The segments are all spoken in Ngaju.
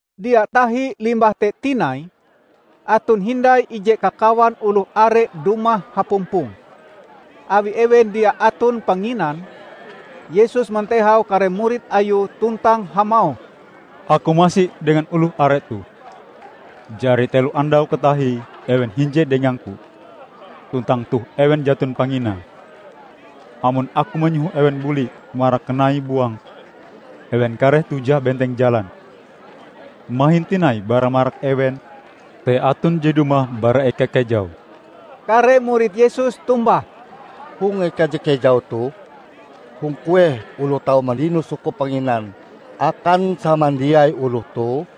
Dia tahi limbah te tinai, aton hindai ije kakawan oloh are dumah hapumpong. Awi ewen dia aton panginan, Yesus mantehau kare murid Ayue tuntang hamauh, "Aku masi dengan oloh are toh. Jari telo andau katahie ewen hinje dengang-Ku tuntang toh ewen jaton panginae. Amon Aku manyoho ewen buli marak kanai buang, ewen kareh tujah benteng jalan. Mahin tinai bara marak ewen te aton je dumah bara eka kejau." Kare murid Yesus tombah, "Hong eka je kejau toh, hong kueh oloh tau mandino sukup panginan akan samandiai oloh toh?"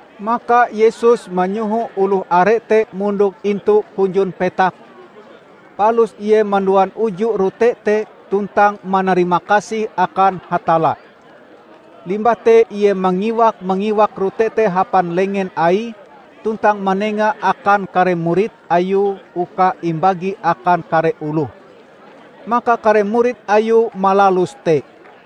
Maka Yesus manyoho oloh are te mondok intu hunjun petak, palus Ie manduan uju rote te tuntang manarimakasih akan Hatalla. Limbah te Ie mangiwak-mangiwak rote te hapan lengen Aie tuntang manengae akan kare murid Ayue uka imbagi akan kare oloh. Maka kare murid Ayue malalus te.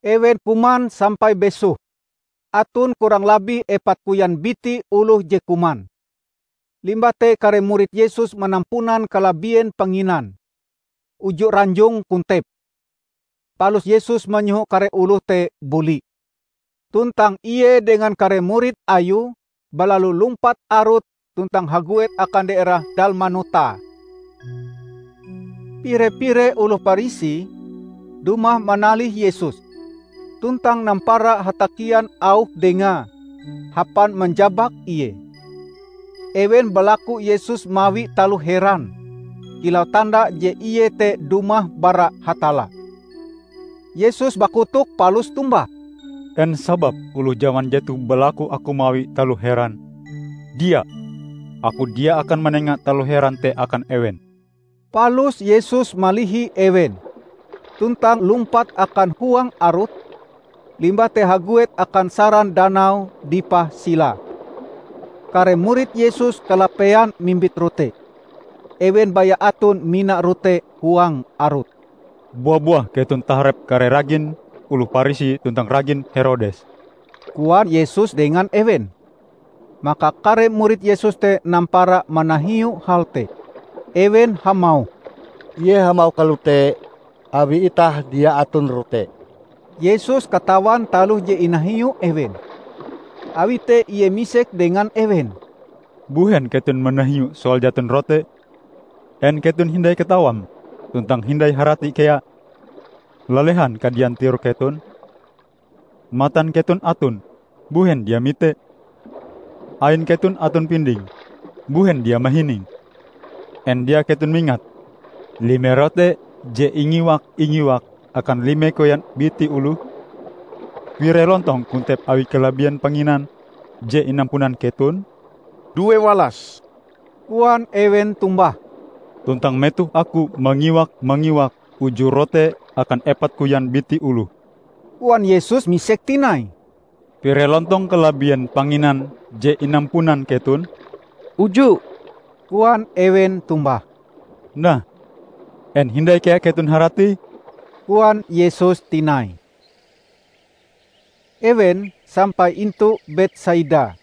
Ewen kuman sampai besoh -- aton kurang labih epat koyan biti oloh je kuman. Limbah te kare murid Yesus manampunan kalabien panginan -- uju ranjong kontep. Palus Yesus manyoho kare oloh te buli, tuntang Ie dengan kare murid Ayue balalu lumpat arut tuntang haguet akan daerah Dalmanuta. Pire-pire oloh Parisi dumah manalih Yesus, tuntang nampara hatakian auh Dengae hapan manjabak Ie. Ewen balaku Yesus mawi taloh heran kilau tanda je Ie te dumah bara Hatalla. Yesus bakotok palus tombah, "En sababe oloh jaman jetoh balaku Aku mawi taloh heran? Dia! Aku dia akan manenga taloh heran te akan ewen!" Palus Yesus malihi ewen, tuntang lumpat akan huang arut; limbah te haguet akan saran danau dipah silae. Kare murid Yesus kalapean mimbit rote. Ewen baya aton mina rote huang arut. "Bua-buah keton taharep kare ragin oloh Parisi tuntang ragin Herodes," koan Yesus dengan ewen. Maka kare murid Yesus te nampara manahiu hal te. Ewen hamauh, "Ie hamauh kalote, awi itah dia aton rote." Yesus katawan taloh je inahiu ewen. Awi te Ie misek dengan ewen, "Mbuhen keton manahiu soal jaton rote? En keton hindai katawam tuntang hindai harati kea? Lalehan kadian tirok keton? Matan keton aton -- mbuhen dia mite? Ain keton aton pinding -- mbuhen dia mahining? En dia keton mingat lime rote je ingiwak-ingiwak akan lime koyan biti oloh? Pire lontong kontep awi kalabien panginan je inampunan keton?" "Duewalas," koan ewen tombah. "Tuntang metoh aku mangiwak-mangiwak uju rote akan epat koyan biti oloh," koan Yesus misek tinai, "Pire lontong kalabien panginan je inampunan keton?" "Uju," koan ewen tombah. "Nah, en hindai kea keton haratie?" koan Yesus tinai. Ewen sampai intu Betsaida.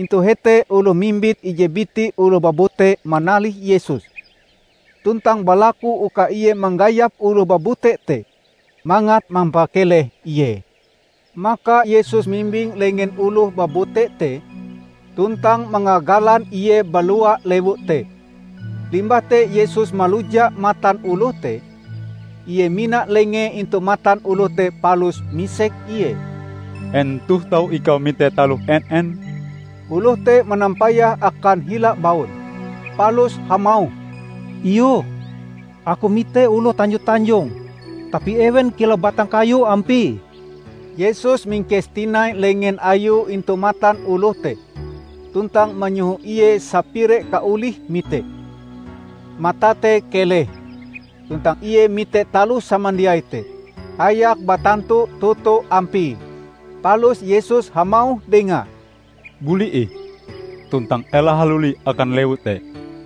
Intu hete oloh mimbit ije biti oloh babute manalih Yesus, tuntang balaku uka Ie manggayap oloh babute te mangat mampakeleh ie. Maka Yesus mimbing lengen oloh babute te tuntang mangagalan ie balua lewu te. Limbah te Yesus maluja matan oloh te. Ie mina lengee intu matan oloh te palus misek ie, "En toh tau ikau mite taloh en-en?" Oloh te manampayah akan hila baun, palus hamauh, "Iyoh. Aku mite oloh tanjo-tanjong; tapi ewen kilau batang kayu ampie." Yesus mingkes tinai lengen Ayue intu matan oloh te tuntang manyoho ie sapire kaolihe mite. Matae te keleh, tuntang ie mite taloh samandiai te hayak batantu toto ampie. Palus Yesus hamauh dengae, "Buli ih, tuntang ela haluli akan lewu te."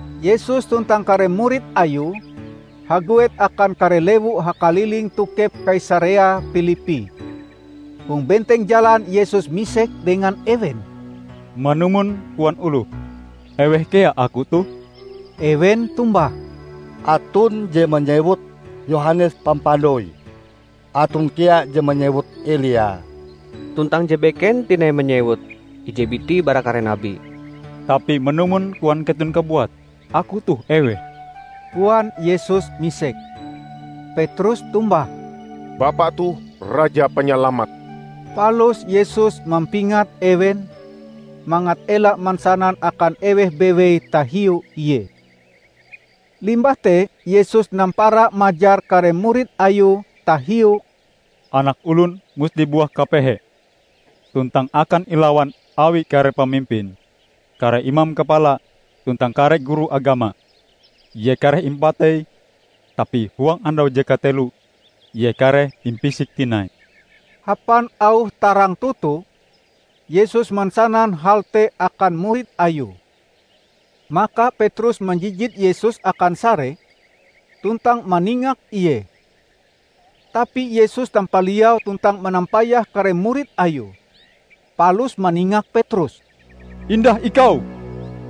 Yesus tuntang kare murid Ayue haguet akan kare lewu hakaliling tokep Kaisarea Pilippi. Hong benteng jalan Yesus misek dengan ewen, "Manumon koan oloh, eweh kea Aku toh?" Ewen tombah, "Aton je manyewut Yohanes Pampandoi; aton kea je manyewut Elia, tuntang je beken tinai manyewut: ije biti bara kare nabi." "Tapi manumon koan keton kabuat, Aku toh eweh?" koan Yesus misek. Petrus tombah, "Bapa toh Raja Panyalamat!" Palus Yesus mampingat ewen, mangat ela mansanan akan eweh bewei tahiu Ie. Limbah te Yesus nampara majar kare murid Ayue tahiu Anak Olon musti buah kapehe, tuntang akan ilawan awi kare pamimpin, kare imam kapala, tuntang kare guru agama. Ie kareh impatei, tapi huang andau je kateloe Ie kareh impisik tinai. Hapan auh tarang toto Yesus mansanan hal te akan murid Ayue. Maka Petrus manjijit Yesus akan sare, tuntang maningak Ie. Tapi Yesus tampaliau tuntang manampayah kare murid Ayue, palus maningak Petrus, "Indah ikau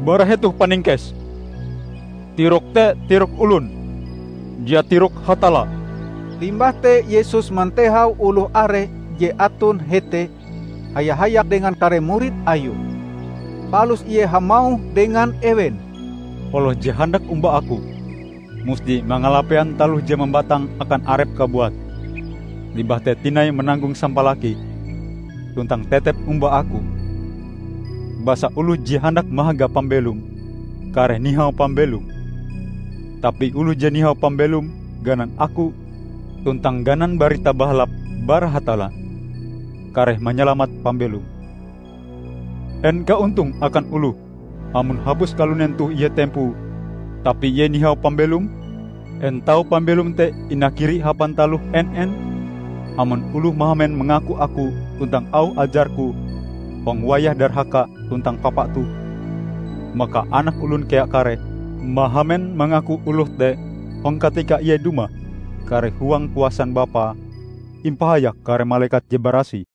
bara hetoh, Paningkes! Tirokm te tirok olon; dia tirok Hatalla!" Limbah te Yesus mantehau oloh are je aton hete haya-hayak dengan kare murid Ayue. Palus Ie hamauh dengan ewen, "Oloh je handak omba Aku, musti mangalapean taloh je mambatang akan arepe kabuat, limbah te tinai mananggong sampalakie, tuntang tetep omba Aku. Basa oloh je handak mahaga pambelome, kareh nihau pambelome. Tapi oloh je nihau pambelome ganan Aku tuntang ganan Barita Bahalap bara Hatalla, kareh manyalamat pambelome. En kaontonge akan oloh, amon hapus kalunen toh ie tempoe, tapi ie nihau pambelome? En tau pambelom te inakiri hapan taloh en-en? Amon oloh mahamen mangaku Aku tuntang auh ajar-Ku hong wayah darhaka tuntang papa toh, maka Anak Olon kea kareh mahamen mangaku oloh te hong katika Ie dumah kareh huang kuasan Bapae, impahayak kare malekat je barasih."